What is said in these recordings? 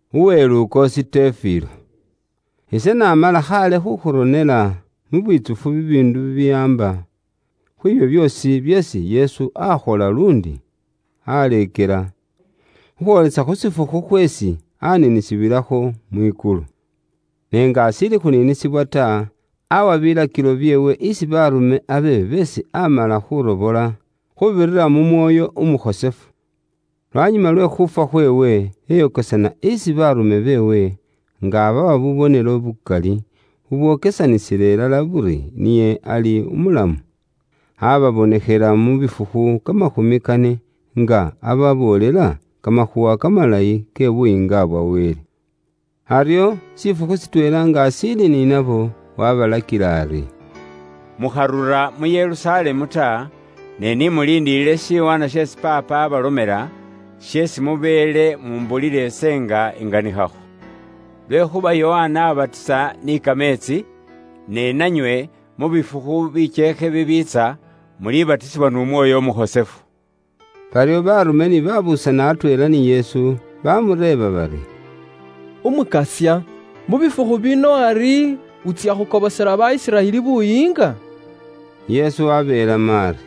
Uwe Lukoosi Tefilo, ise naamala khaale khuukhuronela mu bwitsufu bibiindu bibiwaamba khwiibyo byoosi byeesi Yesu aakhola luundi waaleekela, khukhwoolesa khu shifukhu khweesi aaniinisibwilakho mwikulu. Ne nga ashiili khuniinisibwa ta, aawa biilakilo byeewe isi baarume abe beesi aamala khuurobola, khuubirira mu Mwoyo Umukhosefu. Lwanyuma lwe khuufwa khweewe, eyokesana isi Baarume beewe, nga abawa bubonelo bukali bubwokesanisila ilala buri niye ali umulamu. Aababonekhela mu bifukhu kamakhumi kane, nga ababoolela kamakhuuwa kamalayi ke Buyiinga bwa Wele. Aryo shifukhu shitweela nga ashiili ni nabo, waabalakila ari, “Mukharura mu Yerusalemu ta, ne ni muliindilile shiwaanwa sheesi Paapa aabalomela, sheesi mubeele mumbulila ise nga inganikhakho. Lwekhuuba Yokana aabatisa ni kameetsi, ne nanywe mu bifukhu bikyeekhe bibiitsa, mulibatisibwa n'Umwoyo Umukhosefu.” Baryo baarume ni baabuusana atweela ni Yesu, bamureeba bari, “Umukasya, mu bifukhu bino ari wutsya khukobosela ba Isiraeli Buyiinga?” Yesu wabeelamo ari,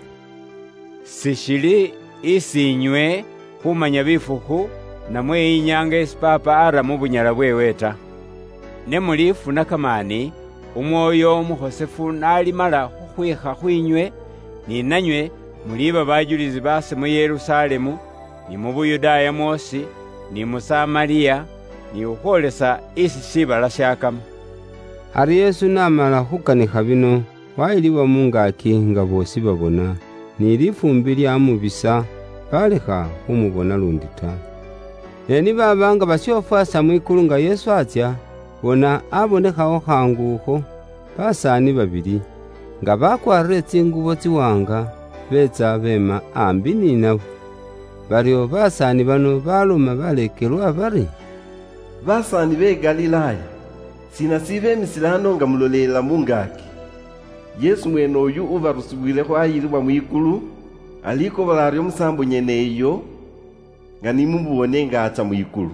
“Sishili isi inywe khumanya bifukhu, namwe inyaanga isi Paapa ara mu bunyala bweewe ta. Ne mulifuna kamaani, Umwoyo Umukhosefu n'alimala khukhwiikha khwiinywe, ni nanywe muliiba bajulisi baase mu Yerusalemu, ni mu Yuda mwoosi, ni mu Samariya, ni khukhwoolesa isi shiibala shakama.” Aryo Yesu n'amala khuukanikha bino, waayilibwa mu ngaaki nga boosi babona, ni lifuumbi lyaamubisa, baalekha khumubona luundi ta. Ne ni baaba nga bashofwaasa mwikulu nga Yesu atsya, bona abonekhawo khaangu akho basaani babili, nga bakwaarire tsingubo tsiwaanga, beetsa beema aambi ni nabo. Baryo basaani bano baaloma baleekelwa bari: “Basaani be Galilaaya, shiina shibeemisile ano nga mulolele mu ngaaki? Yesu mweene uyu ubarusiwilekho waayilibwa mwikulu, alikobola aryo musaambo nyeneyo, nga ni mumuboone nga atsya mwikulu.”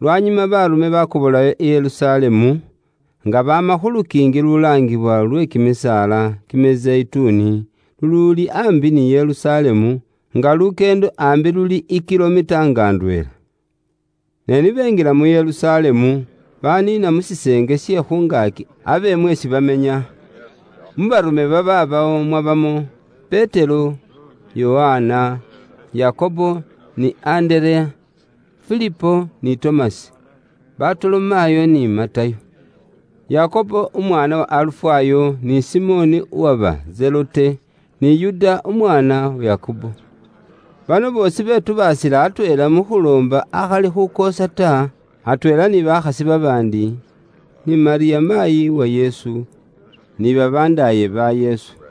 Lwanyuma baarume baakobolayo i Yerusalemu, nga baama khu lukiingi lulaangiwa lwe kimisaala Kimizeyituni, luluuli aambi ni Yerusalemu, nga lukyeendo aambi luli i kilomita nga ndweela. Ne ni benjila mu Yerusalemu, baniina mu shiseenge she khu ngaaki abe mweesi bamenya. Mu baarume babaabawo mwabamo; Petero, Yokana, Yakobo, ni Andereya, Filipo ni Tomasi, Batolomayo ni Matayo, Yakobo umwaana wa Alufayo ni Simoni uwaba Zelote, ni Yuda umwaana wa Yakobo. Bano boosi betubaasila atweela mu khuloomba akhali khukoosa ta, atweela ni bakhasi babaandi, ni Malyamu maayi wa Yesu, ni babandaaye ba Yesu.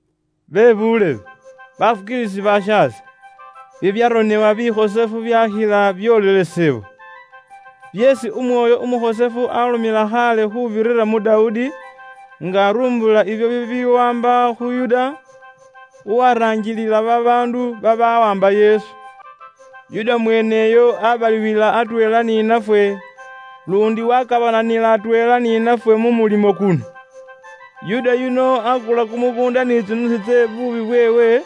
“Bebuulebe, bafukiilisi bashaase, bibyaronebwa bikhosefu byaakhila byoolelesebwa, byeesi Umwoyo Umukhosefu aalomela khaale khuubirira mu Dawudi, nga arumbula ibyo bibiwaamba khu Yuda, uwaranjilila babaandu babaawaamba Yesu. Yuda mweeneyo aabalibwila atweela ni nafwe, luundi waakabananila atweela ni nafwe mu mulimo kuno. Yuda yuno aakula kumukuunda ni tsinusu tse bubwoonaki bweewe,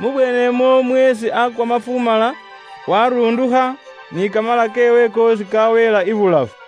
mu bweenemwo mweesi aakwa mafumala, waarundukha ni kamala keewe koosi kaaweela ibulafu.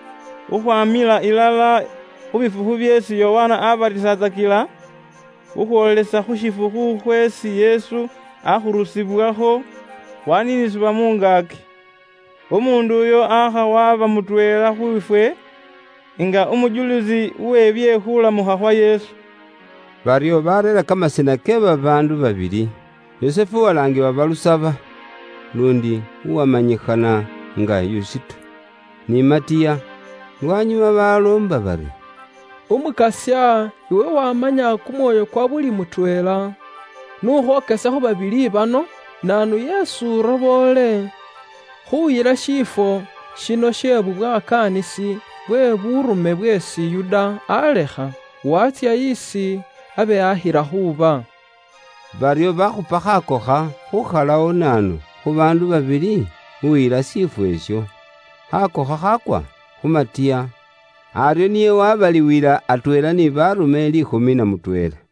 khukhwamila ilala khu bifukhu byeesi Yokana abatisatsakila, khukhwoolesa khu shifukhu khweesi Yesu akhurusibwakho waniinisibwa mu ngaaki. Umuundu uyo aakha waba mutweela khwiifwe nga umujulisi we bye khulamukha khwa Yesu.” Baryo baareera kamasina ke babaandu babili: Yusufu uwalaangiwa Balusaba (luundi uwamanyikhana nga Yusito), ni Matiya. Lwanyuma baloomba bari, “Umukasya, iwe waamanya kumwoyo kwa buli mutweela, n'ukhwokese khu babili bano, naanu yeesi uroboole khuuyila shiifwo shino she bubwakaanisi bwe buurume bweesi Yuda aalekha, waatsya esi abe akhila khuuba.” Baryo baakhupa khaakokha khuukhalawo naanu khu baandu babili uyila shiifwo isho. Khaakokha khaakwa khu Matiya, aryo niye waabaliwila atweela ni baarume liikhumi na mutweela.